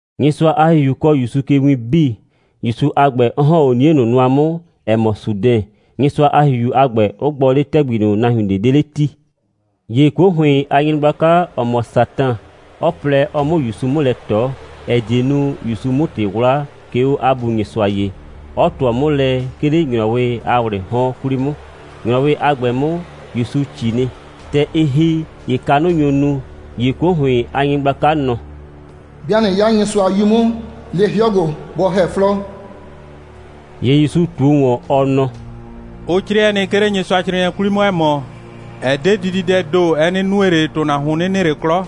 Nyɩsʋa a ‑Hihiu kɔɔ ‑Yusu ke win 'bii, ‑Yusu a ‑gbɛ, 'ɔ ‑hɔn 'o 'nie ꞊nʋ nʋa 'mʋ, ‑ɛ mɔ Sudɛn, Nyɩsʋa a ‑Hihiu a ‑gbɛ, 'ʋ gbɔ 'le ‑tɛgbi ꞊nʋ, nahuin ꞊de 'de 'le 'ti. ‑Ye 'kuo ‑hʋɩn a nyɩgblaka, ‑ɔ mɔ Satan, 'ɔ plɛ, ɔ 'mʋ ‑Yusu 'mʋ lɛ ꞊tɔ, ‑ɛ die nu, ‑Yusu 'mʋ ‑tɩ 'wla, 'ke 'o 'a Bu Nyɩsʋa ye, 'ɔ ꞊tʋɔ 'mʋ lɛ, 'ke 'le ‑nyrɔwɩ a ‑wlɩɩ 'hɔn 'kwli 'mʋ. ‑Nyrɔwɩ a ‑gbɛ 'mʋ, ‑Yusu ꞊ci nɩ. ‑Tɛ ɩ ‑hi, ‑ye kanʋ nyo nu. ‑Ye 'kuo ‑hʋɩn a nyɩgblaka nɔ: «'Bɩa ꞊nɩ 'ya Nyɩsʋa a 'Yu 'mʋ, le 'hɩɔ ‑gbo, bɔ ‑hɛ 'flɔɔ.» ‑Ye ‑Yusu ꞊tuo ‑wɔn, ɔ nɔ: «Ʋ 'crɩɛ nɩ, 'ke 'le Nyɩsʋacrɩɩnɩɛ 'kwli 'mʋ, ‑ɛ mɔ: Ɛ 'de dididɛɛ ‑do, ɛ 'nɩ nue ꞊le, ‑tʋnahuon 'nɩ nɩ ꞊le 'klɔ.»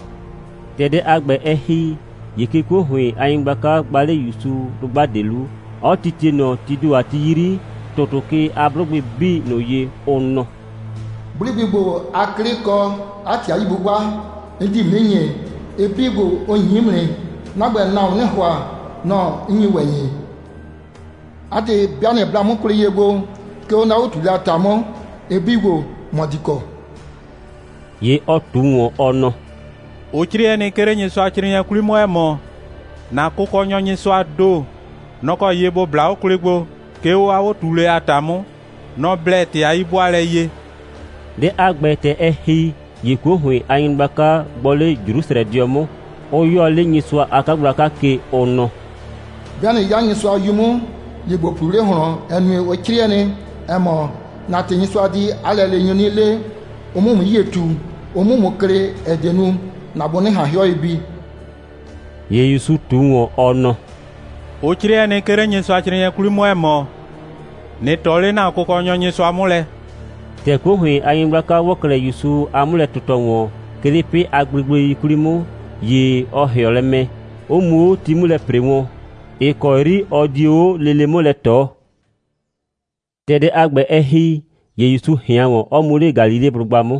‑Tɛ dɛ a ‑gbɛ, ɛ ‑hi, ‑ye 'ke 'kuo ‑hʋɩn a nyɩgblaka gba 'le ‑Yusu dʋgba ꞊de 'lu, 'ɔ titie ꞊nɔ tii ‑do a ti 'yri ‑tʋtʋ ke a 'blʋgbɩ 'bii ꞊nʋ ye, ʋ nɔ: «'Blʋgbɩ ‑gbo a 'klɩ, kɔ 'a ‑tɩ a 'yi'bʋbʋa, 'n di ‑mʋ 'nɩ ‑nyi. Ɩ 'bii ‑gbo, ʋ ‑nyi 'mʋ nɩ. 'Na ‑gbɛ, nahuon 'nɩɩ ‑hʋa, nɔ‑ 'n nyi ‑wɛ ‑nyi. 'A ‑tɩ, 'bɩa ꞊nɩ bla 'mʋ kwlɩ ye gbo, 'ke 'o 'na 'o꞊tuulɛ a ‑ta 'mʋ, ɩ 'bii ‑gbo, ‑mɔ di kɔ.» ‑Ye ɔ ꞊tu ‑wɔn, ɔ nɔ: «Ʋ 'crɩɛ nɩ, 'ke 'le Nyɩsʋacrɩɩnɩɛ 'kwli 'mʋ, ‑ɛ mɔ: ‑Na Kʋkɔnyɔ Nyɩsʋaa ‑do, nɔ‑ kɔ ye ‑bo bla 'o kwlɩ gbo, 'ke 'o 'a 'o꞊tuulɛ a ‑ta 'mʋ. Nɔ‑ blɛ ‑tɩ a 'yi'bʋaalɛ ye.» Dɛ a ‑gbɛ, ‑tɛ ɛ ‑hi, ‑ye 'kuo ‑hʋɩn a nyɩgblaka gbɔ 'le Jrusrɛdɩɔ 'mʋ, 'ʋ 'yɔɔ 'le Nyɩsʋa a 'kagblaka ke, ʋ nɔ: «'Bɩa ꞊nɩ 'ya Nyɩsʋa a 'Yu 'mʋ, ‑ye ‑bo ꞊pluu 'le ꞊hlɔn, ‑ɛ nue, ʋ 'crɩɛ nɩ, ‑ɛ mɔ: ‑Na ‑tɩ, Nyɩsʋa di 'a lɛleenyʋ 'nɩ le, ʋ 'mʋ ‑mʋ 'yie ꞊tu, ʋ 'mʋ ‑mʋ klɩ, ‑ɛ die nu, ‑na bʋ 'nɩ ꞊han 'hɩɔ ye bi.» ‑Ye ‑Yusu ꞊tu ‑wɔn, ɔ nɔ: «Ʋ 'crɩɛ nɩ, 'ke 'le Nyɩsʋacrɩɩnɩɛ 'kwli 'mʋ, ‑ɛ mɔ: ꞊Nɩ ꞊tɔ 'le ‑na Kʋkɔnyɔ Nyɩsʋa 'mʋ lɛ.» ‑Tɛ 'kuo ‑hʋɩn a nyɩgblaka ‑wɔ 'klɛɛ ‑Yusu a 'mʋlɛ꞊tɩtɔ ‑wɔn, 'ke 'le 'pɩ a gblegblei 'kwli 'mʋ, ‑ye ɔ ‑hɩɔ lɛ mɛ, 'ɔ mu 'o ti 'mʋ lɛ ‑pre wɔn, ‑ɩ kɔ 'yri ɔ dio 'o lele 'mʋ lɛ ꞊tɔ. ‑Tɛ dɛ a ‑gbɛ, ɛ ‑hi, ‑ye ‑Yusu ꞊hɩan ‑wɔn, 'ɔ mu 'le Galileblʋgba 'mʋ.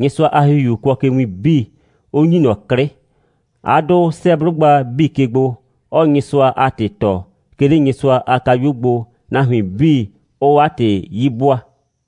Nyɩsʋa a ‑Hihiu kʋɔ ke win 'bii, 'ʋ ‑nyi ꞊nɔ 'klɩ. 'A 'dʋ 'sɛɛ 'blʋgba 'bii ke gbo, 'ɔɔ Nyɩsʋa a ‑tɩ tɔɔ, 'ke 'le Nyɩsʋa a kayuo gbo, nahuin 'bii 'ʋʋ 'a ‑tɩ 'yi 'bʋaa.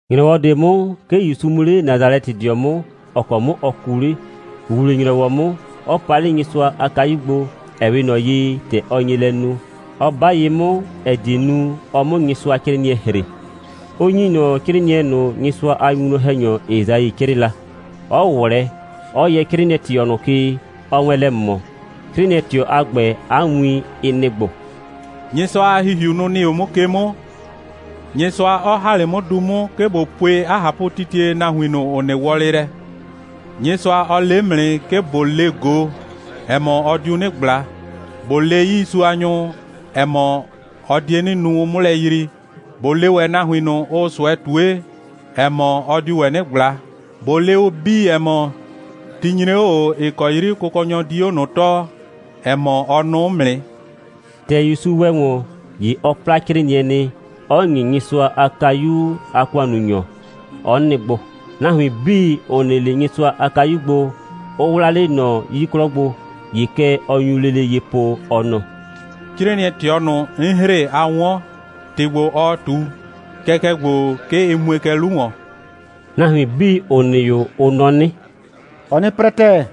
‑Nyrɔwɔ ꞊de 'mʋ, 'ke ‑Yusu mu 'le Nasalɛtɩdɩɔ 'mʋ, ‑ɔ kɔ 'mʋ ɔ kuu 'le. ‑Wuwle‑nyrɔwɔ 'mʋ, 'ɔ pa 'le Nyɩsʋa a kayu gbo, ‑ɛ 'we ꞊nɔ ye, ‑tɛ ɔ nye lɛ nu, 'ɔ 'ba ye 'mʋ, ‑ɛ die nu, ɔ 'mʋ Nyɩsʋacrɩɩnɩɛ ‑hre, 'ʋ ‑nyi ꞊nɔ 'crɩɩnɩɛ ꞊nʋ, Nyɩsʋa a winwlɔn‑hɛnyɔ Esai 'crɩɩ la, 'ɔ ꞊wlɛɛ, 'ɔ yɛ 'crɩɩnɩɛ꞊tɩɔ ꞊nʋ ke, ɔɔ wɛn lɛ ꞊mɔ. 'Crɩɩnɩɛ꞊tɩɔ a ‑gbɛ, 'a win, ɩ nɩ‑ ‑gbo: «Nyɩsʋa a ‑Hihiu, nʋ‑ nɩ 'o 'mʋ ke 'mʋ, Nyɩsʋa 'ɔ ‑ha 'le 'mʋ du 'mʋ, 'ke ꞊bo pue 'a ꞊hapʋtitie nahuin ꞊nʋ, ‑ʋ nɩ wɔlɩ lɛ. Nyɩsʋa, ɔ le 'mʋ nɩ, 'ke ꞊bo le ꞊go, ‑ɛ mɔ, ɔ diu 'nɩ ꞊gbla. ꞊Bo le ‑wɛ 'yiisuanyʋ, ‑ɛ mɔ, ɔ die 'nɩ nu, ʋ 'mʋ lɛ yrii. ꞊Bo le ‑wɛ nahuin ꞊nʋ, ʋʋ ꞊sʋɛ ꞊tue, ‑ɛ mɔ, ɔ diu ‑wɛ 'nɩ ꞊gbla. ꞊Bo le ʋ 'bii, ‑ɛ mɔ, ti nyre 'o ꞊o, ‑ɩ kɔ 'yri Kʋkɔnyɔ di 'o ꞊nʋ tɔɔ, ‑ɛ mɔ, ɔ nʋʋ 'mʋ nɩ.» ‑Tɛ ‑Yusu ‑wɛ ‑wɔn, ‑ye ɔ 'pla 'crɩɩnɩɛ nɩ, 'ɔ ‑nye Nyɩsʋa a kayu a ‑kʋannunyɔ, 'ɔ nɩ gbo. Nahuin 'bii, ‑ʋ nɩ 'le Nyɩsʋa a kayu gbo, ʋ 'wlaa 'le ꞊nɔ 'yii 'klɔ gbo. ‑Ye kɛ ɔ nyu lele ye po, ɔ nɔ: «'Crɩɩnɩɛ꞊tɩɔ ꞊nʋ, 'n ‑hre, a 'wɔn, ‑tɩ ‑gbo, ɔɔ ꞊tu, kɛkɛ ‑gbo, 'ke ɩ mue kɛ 'lu ‑wɔn.» Nahuin 'bii, ‑ʋ nɩ 'o, ʋ nɔ 'nɩ: «Ɔɔ 'nɩ 'prɛ ‑tɛɛ.»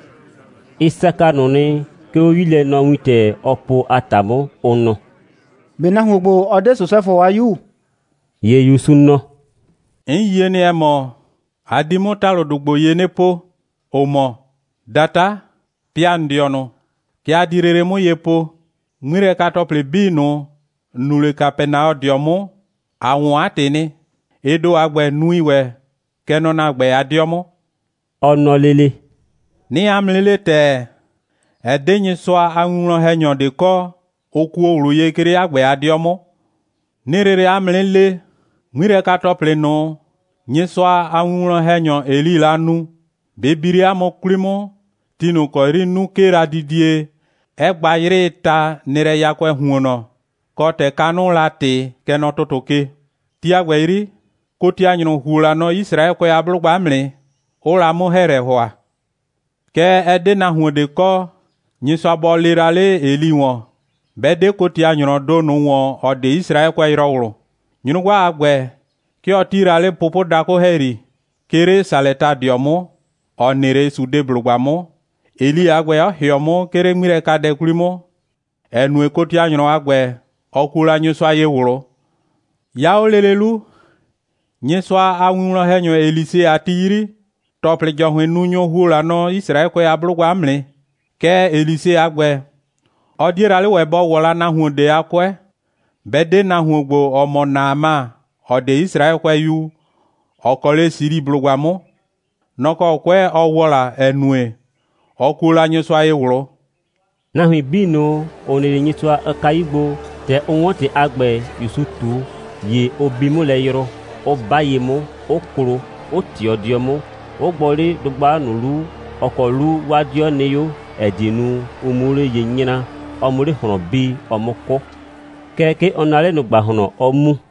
Ɩ saka ꞊nʋ nɩ, 'ke 'o 'yilɛnɔwintɛ, ɔɔ po a ‑ta 'mʋ, ʋ nɔ: «꞊Be nahuon ‑gbo, ɔ 'de Sosɛfʋ a 'yu?» ‑Ye ‑Yusu nɔ: «'N yie nɩ, ‑ɛ mɔ, a di 'mʋ ‑talʋdʋ ‑gbo ye 'nɩ po, ‑ʋ mɔ: ‑Data, pɩa ‑n dɩɔnʋ. Kɛ a di lele 'mʋ ye po: 'Ŋmilɛka‑tɔplɩ 'bii ꞊nʋ, ‑n nu 'le Kapɛnaɔdɩɔ 'mʋ, ‑a 'wɔn 'a ‑tɩ nɩ. Ɩ ‑do a ‑gbɛ, nui ‑wɛ, kɛ nɔ ‑na ‑gbɛ a 'dɩɔ 'mʋ.» Ɔ nɔ lele: «'Nɩɩ 'a mʋ 'nɩ le ‑tɛɛ, ɛ 'de Nyɩsʋa a winwlɔn‑hɛnyɔ ꞊de kɔ, ʋ kuo ꞊wlʋ ye, 'ke 'le 'a ‑gbɛ a 'dɩɔ 'mʋ. 'Nɩɩ lele 'a mʋ 'nɩ le, 'ŋmilɛka‑tɔplɩ ꞊nʋ, Nyɩsʋa a winwlɔn‑hɛnyɔ Elii la nu, bɩ bi 'le 'a mʋ 'kwli 'mʋ, ti ꞊nʋ ‑kɔ 'yri 'nu 'kee la didie, 'ɛ gba 'yrɩɩ ta, nɩ lɛ yakʋɛɛ ‑huonnɔ, kɔ, ‑tɛ kanʋʋ la ꞊tɩ, kɛ nɔ ‑tʋtʋ ke. Ti a ‑gbɛ 'yri, kotianyrʋ ‑huo la nɔ Yisraɛkʋɛ a 'blʋgba 'mʋ nɩ, 'ʋʋ la 'mʋ‑hɛɛlɛ ‑hʋa. Kɛɛ, ɛ 'de la 'a nahuon ꞊de kɔ, Nyɩsʋa bɔ lee la 'le Eli ‑wɔn, 'bɛ 'de kotianyrɔɔ ‑do ꞊nʋ ‑wɔn, ‑ɔ 'de Yisraɛkʋɛyrɔwlʋ. Nyrʋgba a ‑gbɛ, 'ke ɔ 'ti la 'le pʋpʋdakʋ ‑hɛyri, 'ke 'le Salɛtadɩɔ 'mʋ, ‑ɔ nɩ 'le Sidɔblʋgba 'mʋ, Eli a ‑gbɛ 'ɔ ‑hɩɔ 'mʋ, 'ke 'le 'ŋmilɛkadɛ 'kwli 'mʋ, ‑ɛ nue, kotianyrɔ, a ‑gbɛ, ɔ kuo la Nyɩsʋa ye ꞊wlʋ. 'Ya 'o lele 'lu, Nyɩsʋa a winwlɔn‑hɛnyɔ Elise a ti 'yri, ‑tɔplɩ‑jɔhʋɩnnunyʋ ‑huo la nɔ Yisraɛkʋɛ a 'blʋgba 'mʋ nɩ. Kɛɛ, Elise a ‑gbɛ, ɔ 'die la 'le ‑wɛ, bɔ ‑wɔ la nahuon ꞊de a 'kʋɛ, 'bɛ 'de nahuon ‑gbo, ‑ɔ mɔ Naama, ‑ɔ 'de Yisraɛkʋɛyu, ‑ɔ kɔ 'le Siliblʋgba 'mʋ. Nɔ‑ kɔ 'kʋɛ ɔ ‑wɔ la, ‑ɛ nue, ɔ kuo la Nyɩsʋa ye ꞊wlʋ.» Nahuin 'bii ꞊nʋ, ‑ʋ nɩ 'le Nyɩsʋa a kayu gbo, ‑tɛ ʋ 'wɔn ‑tɩ a ‑gbɛ, ‑Yusu ꞊tu, ‑ye ʋ bi 'mʋ lɛ yrʋ, 'ʋ 'ba ye 'mʋ, 'ʋ klo, 'ʋ ꞊tɩɔ 'dɩɔ 'mʋ, 'ʋ gbɔ 'le dʋgba ꞊nʋ 'lu, ‑ɔ kɔ 'lu 'waa 'dɩɔ nɩ 'o, ‑ɛ die nu, ʋ 'muo 'le ye 'nyraa, ɔ 'mʋ 'le ꞊hlɔn bii, ɔ 'mʋ 'kʋ. Kɛɛ, 'ke ɔ naa 'le ꞊nʋ ‑gbahlɔn, 'ɔ mu.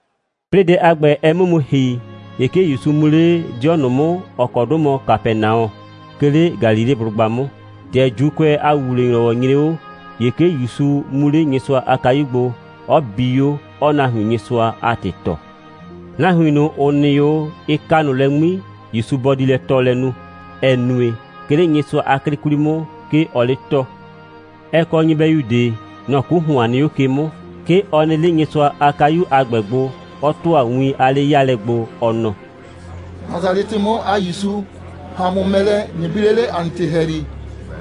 'Plɩɩ dɛ a ‑gbɛ, ɛ 'mʋ mu ‑hi, ‑ye 'ke ‑Yusu mu 'le 'dɩɔ ꞊nʋ 'mʋ, ‑ɔ kɔ 'dʋ mɔ Kapɛnaɔ, 'ke 'le Galileblʋgba 'mʋ. ‑Tɛ ‑Juukʋɛ a ‑wuwle‑nyrɔwɔ nyre 'o, ‑ye 'ke ‑Yusu mu 'le Nyɩsʋa a kayu gbo, 'ɔ bi 'o, 'ɔɔ nahuin Nyɩsʋa a ‑tɩ tɔɔ. Nahuin ꞊nʋ, ‑ʋ nɩ 'o, ɩ ka ꞊nʋ lɛ 'ŋmi, ‑Yusu bɔ di lɛ tɔɔlɛ nu, ‑ɛ nue, 'ke 'le Nyɩsʋa a 'klɩ 'kwli 'mʋ, 'ke ɔɔ 'le tɔɔ. Ɛ kɔ nyɩbɛyu ꞊de. Nɔ‑ 'ku ‑hʋan nɩ 'o ke 'mʋ. 'Ke ɔ nɩ 'le Nyɩsʋa a kayu a ‑gbɛ gbo, 'ɔ ‑tʋa win a 'le'yaalɛ gbo, ɔ nɔ: «Nasalɛtɩ 'mʋ a ‑Yusu, ‑ha ‑a mʋ mɛ lɛ, ꞊nɩ bi 'le 'le ‑a nɩ ‑tɩ ‑hɛyri.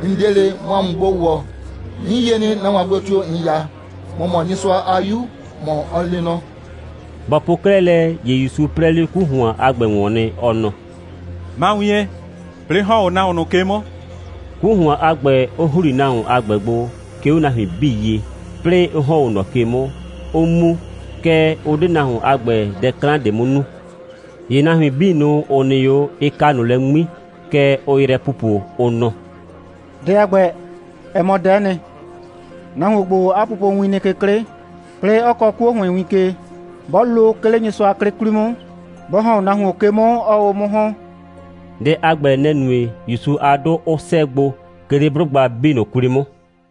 ‑N 'de ꞊le, ꞊mʋ ‑a mʋ gbo ‑wɔ. 'N yie nɩ, nahuon a gblo tio‑ ‑n 'ya. ‑Mɔ mɔ Nyɩsʋa a 'Yu, ‑mɔ ɔ lee nɔ.» Bɔ po 'klɛɛ lɛ, ‑ye ‑Yusu 'prɛɛ 'le 'ku ‑hʋan a ‑gbɛ ‑wɔn nɩ, ɔ nɔ: «Ma wien, 'plɩɩ ‑hɔn 'o nahuon ꞊nʋ ke 'mʋ!» 'ku ‑hʋan a ‑gbɛ, 'ʋ ‑hli nahuon a ‑gbɛ gbo, 'ke 'o nahuin 'bii ye, 'plɩɩ 'ʋ ‑hɔn 'o ꞊nɔ ke 'mʋ, 'ʋ mu, kɛɛ, ʋ 'de nahuon a ‑gbɛ dɛ 'klan ꞊de 'mʋ nu. ‑Ye nahuin 'bii ꞊nʋ, ‑ʋ nɩ 'o, ɩ ka ꞊nʋ lɛ 'ŋmi. Kɛ ʋʋ yrɛ pupo, ʋ nɔ: «Dɛ a ‑gbɛ, ɛ mɔ dɛ'ɛ nɩ. Nahuon ‑gbo, 'a pupowin nɩ ke 'klɩ, 'plɩɩ, 'ɔ kɔɔ 'kuo ‑hʋɩn win ke. 'Bɔ lo, 'ke 'le Nyɩsʋa a 'klɩ 'kwli 'mʋ, bɔ ‑hɔn 'o nahuon ke 'mʋ, 'ɔɔ 'o 'mʋ ‑hɔn.» Dɛ a ‑gbɛ, nɛ‑ nue, ‑Yusu a 'dʋ 'ʋ 'sɛɛ gbo, 'ke 'le 'blʋgba 'bii ꞊nʋ 'kwli 'mʋ.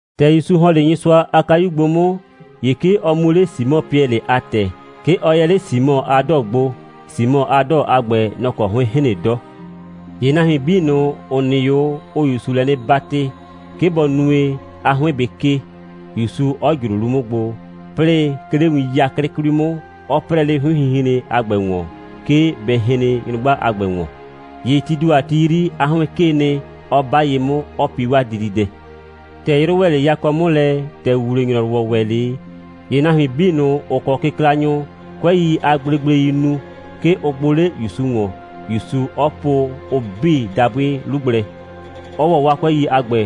‑Tɛ ‑Yusu ‑hɔn 'le Nyɩsʋa a kayu gbo 'mʋ, ‑ye 'ke ɔ mu 'le Simɔ (Piɛlɩ) a ‑tɛ. 'Ke ɔ yɛ 'le Simɔ a 'dɔɔ gbo, Simɔ a 'dɔɔ a ‑gbɛ, nɔ‑ kɔ 'hʋɩn hren 'dɔ. ‑Ye nahuin 'bii ꞊nʋ, ‑ʋ nɩ 'o, ʋʋ ‑Yusu lɛ 'nɩ 'batɩ, 'ke bɔ nue, 'a 'hʋɩn bɩ 'kee, ‑Yusu 'ɔ ꞊jro 'lu 'mʋ gbo, 'plɩɩ, 'ke 'le win 'yaklɩ 'kwli 'mʋ, 'ɔ 'prɛɛ 'le 'hʋɩnhinhren a ‑gbɛ ‑wɔn, 'ke bɛ hren nyrʋgba a ‑gbɛ ‑wɔn. ‑Ye tii ‑do a ti 'yri, 'a 'hʋɩn 'kee nɩ, 'ɔ 'ba ye 'mʋ, 'ɔ pi 'waa dididɛ. ‑Tɛ 'yrʋ ‑wɛ 'le yakɔ 'mʋ lɛ, ‑tɛ ‑wuwle‑nyrɔwɔ ‑wɛ 'le, ‑ye nahuin 'bii ꞊nʋ, ‑ʋ kɔ kɩklanyʋ, 'kʋɛi a gblegbleii nu, 'ke ʋ gbʋ 'le ‑Yusu ‑wɔn, ‑Yusu 'ɔ po ʋ 'bii dabʋɩ 'lu gblɛ, 'ɔ ‑wɔ 'waa 'kʋɛi a ‑gbɛ,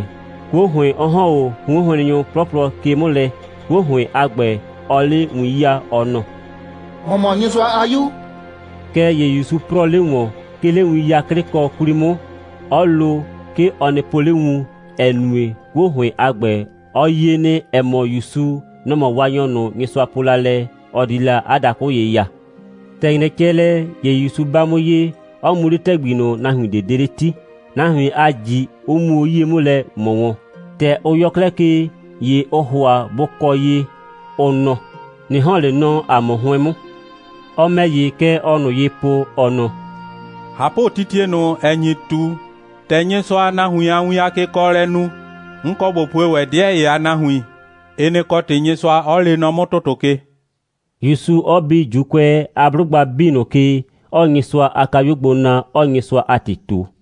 'kuo ‑hʋɩn 'ɔ ‑hɔn 'o 'hʋɩnhrennyʋ 'plɔplɔ ke 'mʋ lɛ, 'kuo ‑hʋɩn a ‑gbɛ 'ɔɔ 'le win 'yaa, ɔ nɔ: «‑Mɔ mɔ Nyɩsʋa a 'Yu!» Kɛɛ ‑ye ‑Yusu 'prɔɔ 'le ‑wɔn, 'ke 'le win 'yaklɩkɔ 'kwli 'mʋ, 'ɔ lo, 'ke ɔ nɩ po 'le wun, ‑ɛ nue, 'kuo ‑hʋɩn a ‑gbɛ, ɔ yie nɩ, ‑ɛ mɔ, ‑Yusu, nɔ‑ mɔ Waanyɔ ꞊nʋ, Nyɩsʋa po la lɛ, ɔ di la 'a dakʋ ye ya. ‑Tɛ ‑nyrɛ cɛ lɛ, ‑ye ‑Yusu 'ba 'mʋ ye, 'ɔ mu 'le ‑tɛgbi ꞊nʋ, nahuin ꞊de 'de 'le 'ti, nahuin a ꞊ji 'ʋ muo 'yie 'mʋ lɛ ꞊mɔ wɔn. ‑Tɛ ʋ yɔ 'klɛɛ ke, ‑ye ʋʋ ‑hʋa bʋ kɔ ye, ʋ nɔ: «꞊Nɩ ‑hɔn 'le nɔ ‑a mʋ 'hʋɩn 'mʋ.» Ɔ ‑mɛ ‑ye, kɛ ɔɔ ꞊nʋ ye po, ɔ nɔ: «꞊Hapʋtitie ꞊nʋ, ‑ɛ nyi ꞊tu, ‑tɛ Nyɩsʋaa nahuin a win a kekɔɔlɛ nu, 'n kɔ ꞊bo pue ‑wɛ 'dɩɛ ‑ye a nahuin; ɩ nɩ‑ kɔ ‑tɩ Nysɩʋa 'ɔ lee nɔ 'mʋ ‑tʋtʋ ke,» ‑Yusu 'ɔ bi ‑Juukʋɛ a 'blʋgba 'bii ꞊nʋ ke, 'ɔɔ Nyɩsʋa a kayuo gbo na, 'ɔɔ Nyɩsʋa a ‑tɩ ꞊tu.